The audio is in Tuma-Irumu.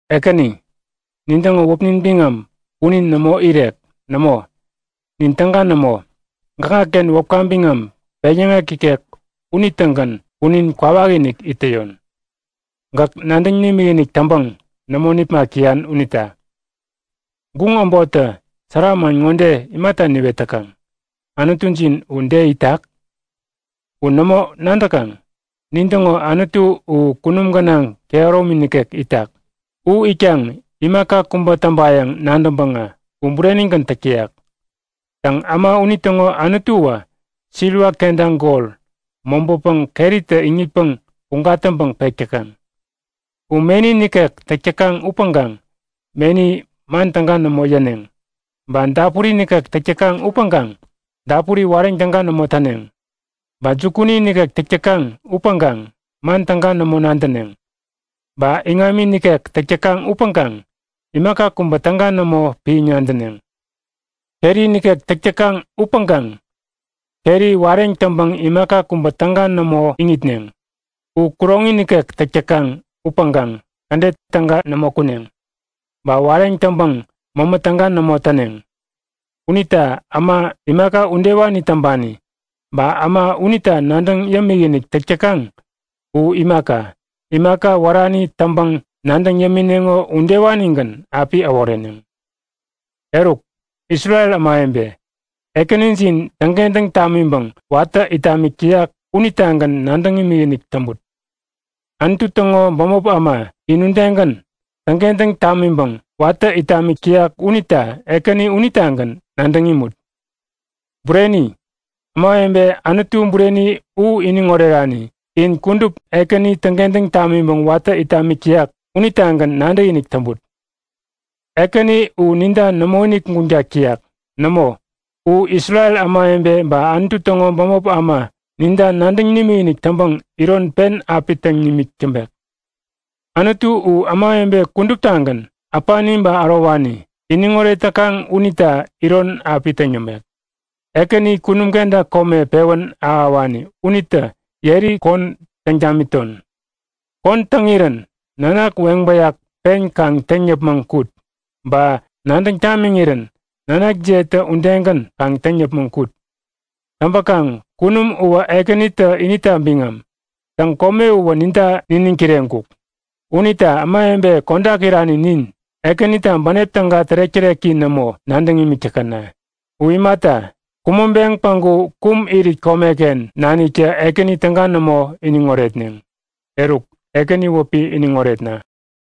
Ekäni, nintäŋo wäpnin biŋam punin nämo irek. Nämo, nin täga nämo! Gäkŋaken wäpka biŋam peŋyäŋek ikek unitägän punin kwawakinik it täyon, gäk nadäŋ nimikinik täŋpäŋ nämo nipmak täyan unita. Guŋ äbottä sära man ŋode imata niwet täkaŋ; Anutujin u de itak? U nämo nadäkaŋ? Nin täŋo Anutu u kunum gänaŋ kehäromi nikek itak. U itkaŋ imaka kubä täŋpayäŋ nadäŋpäŋä u burenigän täk täyak. Täŋ äma unitäŋo anutuwä siliwa kenta gol mobäpäŋ keritä iŋitpäŋ puŋ gatäŋpäŋ pek täkaŋ. U meni nikek täk täkaŋ upäŋkaŋ meni man täga nämo yäneŋ. Ba dapuri nikek täk täkaŋ upäŋkaŋ dapuri wareŋ täga nämo täneŋ. Ba jukuni nikek täk täkaŋ upäŋkaŋ man täga nämo nadäneŋ. Ba iŋami nikek täk täkaŋ upäŋkaŋ imaka kubä täga nämo piäŋ nadäneŋ. Keri nikek täk täkaŋ upäŋkaŋ keri wareŋ täŋpäŋ imaka kubä täga nämo iŋitneŋ. U kuroŋi nikek täk täkaŋ upäŋkaŋ kädet täga nämo kuneŋ. Ba wareŋ täŋpäŋ mämä täga nämo täneŋ. Unita äma imaka udewani täŋpani, ba äma unita nadäŋ yämik-inik täk täkaŋ u imaka, imaka wärani täŋpäŋ nadäŋ yämineŋo udewanigän api äworeneŋ! Eruk, Isrel ämawebe, Ekänijin täŋkentäŋ tamiŋpäŋ watä it tamik täyak unitagän nadäŋ imikinik täŋput. Anutu täŋo bämop äma, in udegän täŋkentäŋ tamiŋpäŋ watä it tamik täyak unita Ekäni unitagän nadäŋ imut. Bureni, ämawebe Anutu bureni u iniŋ orerani in kudup Ekäni täŋkentäŋ tamiŋpäŋ watä it tamik täyak unitagän nadäkinik täŋput. Ekäni u ninta nämoinik guŋtak täyak. Nämo, u Isrel ämawebe ba Anutu täŋo bämop äma ninta nadäŋ nimikinik täŋpäŋ iron pen api täŋ nimik täŋpek. Anutu u ämawebe kuduptagän, äpani ba ärowani iniŋoret täkaŋ unita iron api täŋ yämek. Ekäni kunum kenta kome pewän ahäwani unitä yeri kon täŋ tamiton. Kon täŋirän nanak weŋ bäyak pen kaŋ täŋ yäpmäŋ kut! Ba nadäŋ tamiŋirän nanakjiyetä udegän kaŋ täŋ yäpmäŋ kut! Täŋpäkaŋ kunum uwä Ekänitä inita biŋam. Täŋ kome uwä ninta niniŋ kireŋkuk. Unita ämawebe kodak irani nin, Ekänita bänep täga tärek-täreki nämo nadäŋ imik täkäna. U imata, kumäŋpeŋ päŋku kum irit komeken naniktä Ekäni täga nämo iniŋ oretneŋ. Eruk, Ekäni wäpi iniŋ oretna!